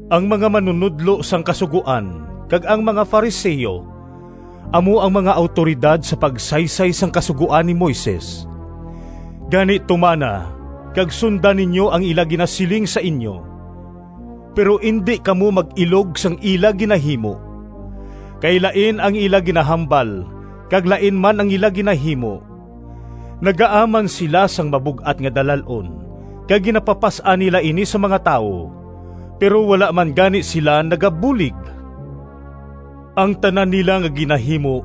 “Ang mga manunodlo sang Kasugoan kag ang mga Fariseo, amo ang mga awtoridad sa pagsaysay sang Kasugoan ni Moises. Gani tumana kag sunda ninyo ang ila ginasiling sa inyo, pero indi kamo mag-ilog sang ila ginahimo, kay lain ang ila ginahambal kag lain man ang ila ginahimo. Nagaaman sila sang mabug-at nga dalal-on kag ginapapas-an nila ini sa mga tawo, pero wala man gani sila nagabulig. Ang tanan nila nga ginahimo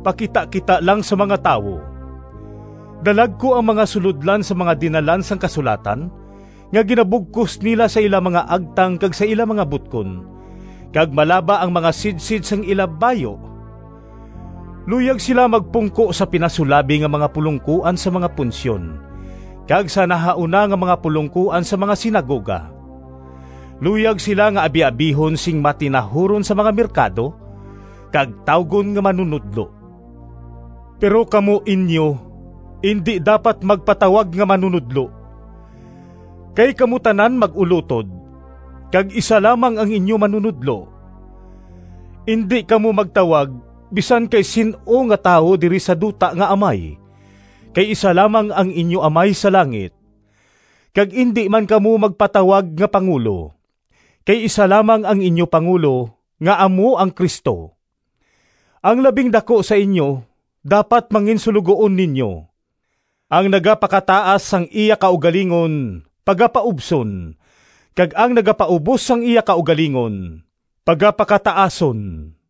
pakitakita lang sa mga tawo. Dalagku ang mga sulodlan sang mga dinalan sang kasulatan nga ginabugkos nila sa ila mga agtang kag sa ila mga butkon kag malaba ang mga sidsid sang ila bayu! Luyag sila magpungko sa pinasulabi nga mga pulongkoan sa mga punsyon kag sa nahauna nga mga pulongkoan sa mga sinagoga. Luyag sila nga abiabihon sing matinahuron sa mga merkado, kag tawgon nga ‘Manunodlo.’ Pero kamo inyo indi dapat magpatawag nga ‘Manunodlo,’ kay kamo tanan mag-ulotod, kag isa lamang ang inyo Manunodlo. Indi kamo magtawag bisan kay sin-o nga tawo diri sa duta nga ‘Amay,’ kay isa lamang ang inyo amay sa langit. Kag indi man kamo magpatawag nga ‘Pangulo,’ kay isa lamang ang inyo pangulo nga amo ang Cristo. Ang labing daku sa inyo dapat manginsuloguon ninyo. Ang nagapakataas sang iya kaugalingon pagapaubson, kag ang nagapaubos sang iya kaugalingon pagapakataason.”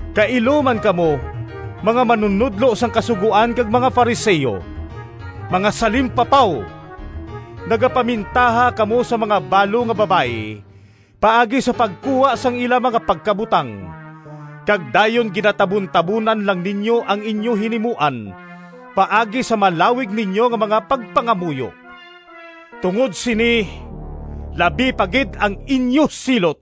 “Kailo man kamo, mga manunodlo sang Kasugoan kag mga Fariseo! Mga salimpapaw! Nagapamintaha kamo sa mga balo nga babayi paagi sa pagkuha sang ila mga pagkabutang kag dayon ginatabuntabonan lang ninyo ang inyo hinimuan paagi sa malawig ninyo nga mga pagpangamuyo! Tungod sini labi pa gid ang inyo silot!]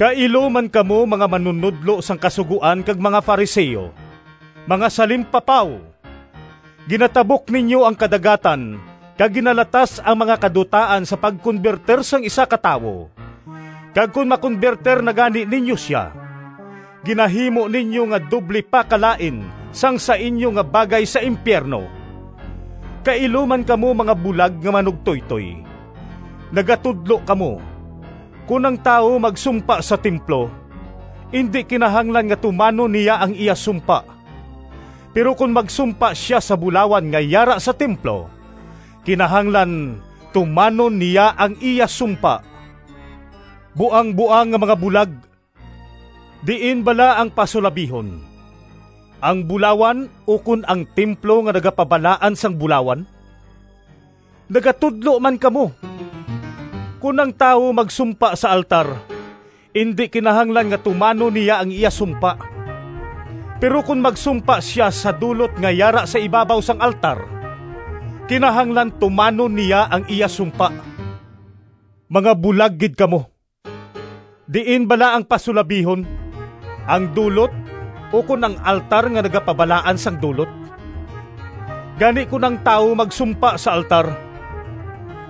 “Kailo man kamo, mga manunodlo sang Kasugoan kag mga Fariseo! Mga salimpapaw! Ginatabok ninyo ang kadagatan kag ginalatas ang mga kadutaan sa pagkonbertir sang isa ka tawo, kag kon makonbertir na gani ninyo sia, ginahimo ninyo nga doble pa kalain sang sa inyo nga bagay sa impiyerno! “Kailo man kamo, mga bulag nga manugtoytoy! Nagatudlo kamo, ‘Kon ang tawo magsumpa sa templo, indi kinahanglan nga tumanon niya ang iya sumpa. Pero kon magsumpa sia sa bulawan nga yara sa templo, kinahanglan tumanon niya ang iya sumpa.’ Buangboang nga mga bulag! Diin bala ang pasulabihon, ang bulawan ukon ang templo nga nagapabalaan sang bulawan? Nagatudlo man kamo, ‘Kon ang tawo magsumpa sa altar, indi kinahanglan nga tumanon niya ang iya sumpa, pero kon magsumpa sia sa dulot nga yara sa ibabaw sang altar, kinahanglan tumanon niya ang iya sumpa.’ Mga bulag gid kamo! Diin bala ang pasulabihon, ang dulot ukon ang altar nga nagapabalaan sang dulot? Gani kon ang tawo magsumpa sa altar,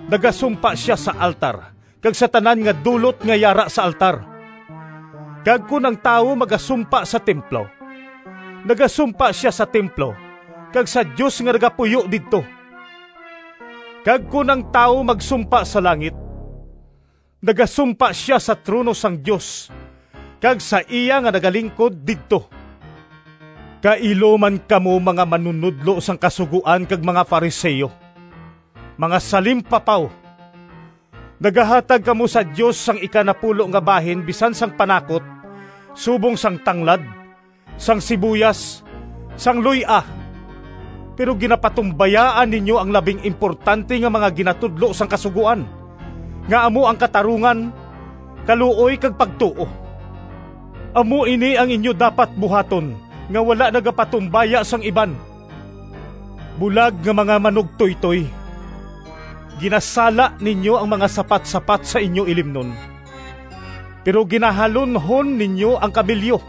nagasumpa sia sa altar kag sa tanan nga dulot nga yara sa altar. Kag kon ang tawo magasumpa sa templo, nagasumpa sia sa templo kag sa Dios nga nagapuyo didto. Kag kon ang tawo magsumpa sa langit nagasumpa sia sa trono sang Dios kag sa iya nga nagalingkod didto. “Kailo man kamo, mga manunodlo sang Kasugoan kag mga Fariseo! Mga salimpapaw! Nagahatag kamo sa Dios sang ikanapulo nga bahin bisan sang panakot subong sang tanglad, sang sibuyas, sang luy-a, pero ginapatumbayaan ninyo ang labing importante nga mga ginatudlo sang Kasugoan, nga amo ang katarungan, kaluoy kag pagtuo. Amo ini ang inyo dapat buhaton, nga wala nagapatumbaya sang iban. Bulag nga mga manugtoytoy! Ginasala ninyo ang mga sapatsapat sa inyo ilimnon, pero ginahalunhon ninyo ang kamelyo!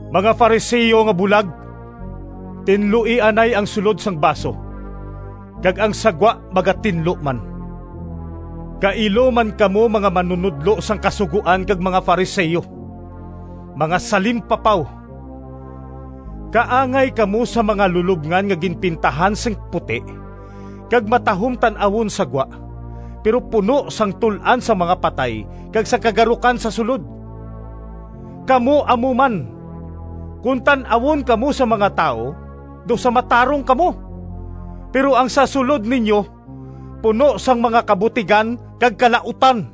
Mga Fariseo nga bulag! Tinloi anay ang sulod sang baso, kag ang sa gwa magatinlo man. “Kailo man kamo, mga manunodlo sang Kasugoan, kag mga Fariseo! Mga salimpapaw! Kaangay kamo sang mga lulobngan nga ginpintahan sing puti kag matahom tan-awon sa gwa, pero puno sang tul-an sang mga patay kag sang kagarukan sa sulod. Kamo amo man! Kon tan-awon kamo sang mga tawo daw sa matarong kamo, pero ang sa sulod ninyo puno sang mga kabutigan kag kalautan.”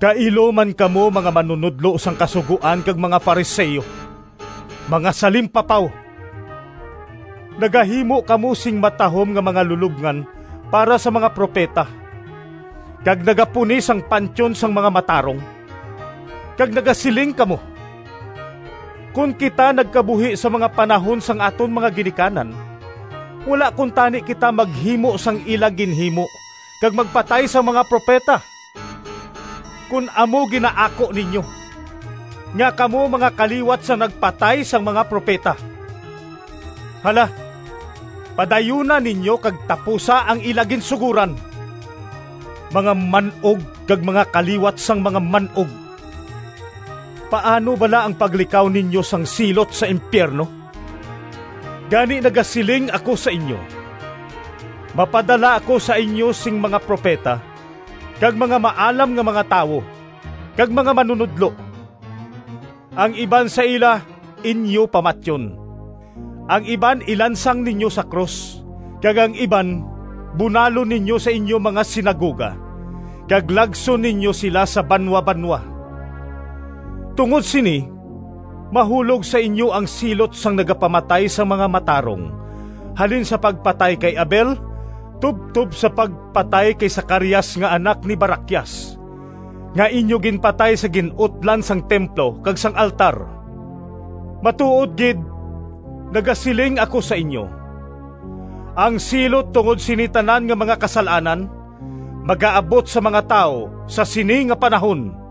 “Kailo man kamo, mga manunodlo sang Kasugoan kag mga Fariseo! Mga salimpapaw! Nagahimo kamo sing matahom nga mga lulobngan para sa mga propeta kag nagapuni sang pantyon sang mga matarong, kag nagasiling kamo, ‘Kon kita nagkabuhi sa mga panahon sang aton mga ginikanan, wala kuntani kita maghimo sang ila ginhimo kag magpatay sang mga propeta.’ Kon amo ginaako ninyo nga kamo mga kaliwat sang nagpatay sang mga propeta! Hala, padayuna ninyo kag tapusa ang ila ginsugoran! Mga man-og kag mga kaliwat sang mga man-og! Paano bala ang paglikaw ninyo sang silot sa impiyerno? Gani nagasiling ako sa inyo: mapadala ako sa inyo sing mga propeta kag mga maalam nga mga tawo, kag mga manunodlo; ang iban sa ila inyo pamatyon, ang iban ilansang ninyo sa krus, kag ang iban bunalon ninyo sa inyo mga sinagoga, kag lagson ninyo sila sa banwabanwa. Tungod sini, mahulog sa inyo ang silot sang nagapamatay sang mga matarong, halin sa pagpatay kay Abel tubtob sa pagpatay kay Zacarias nga anak ni Baraquias, nga inyo ginpatay sa gin-utlan sang templo kag sang altar. Matuod gid nagasiling ako sa inyo: ang silot tungod sini tanan nga mga kasal-anan magaabot sa mga tawo sa sini nga panahon!”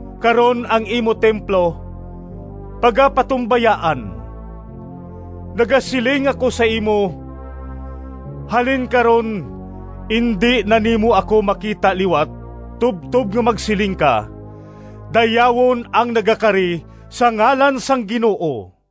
Karon ang imo templo pagapatumbayaan. Nagasiling ako sa imo, halin karon indi na nimo ako makita liwat tubtob nga magsiling ka, ‘Dayawon ang nagakari sa ngalan sang Ginoo.’”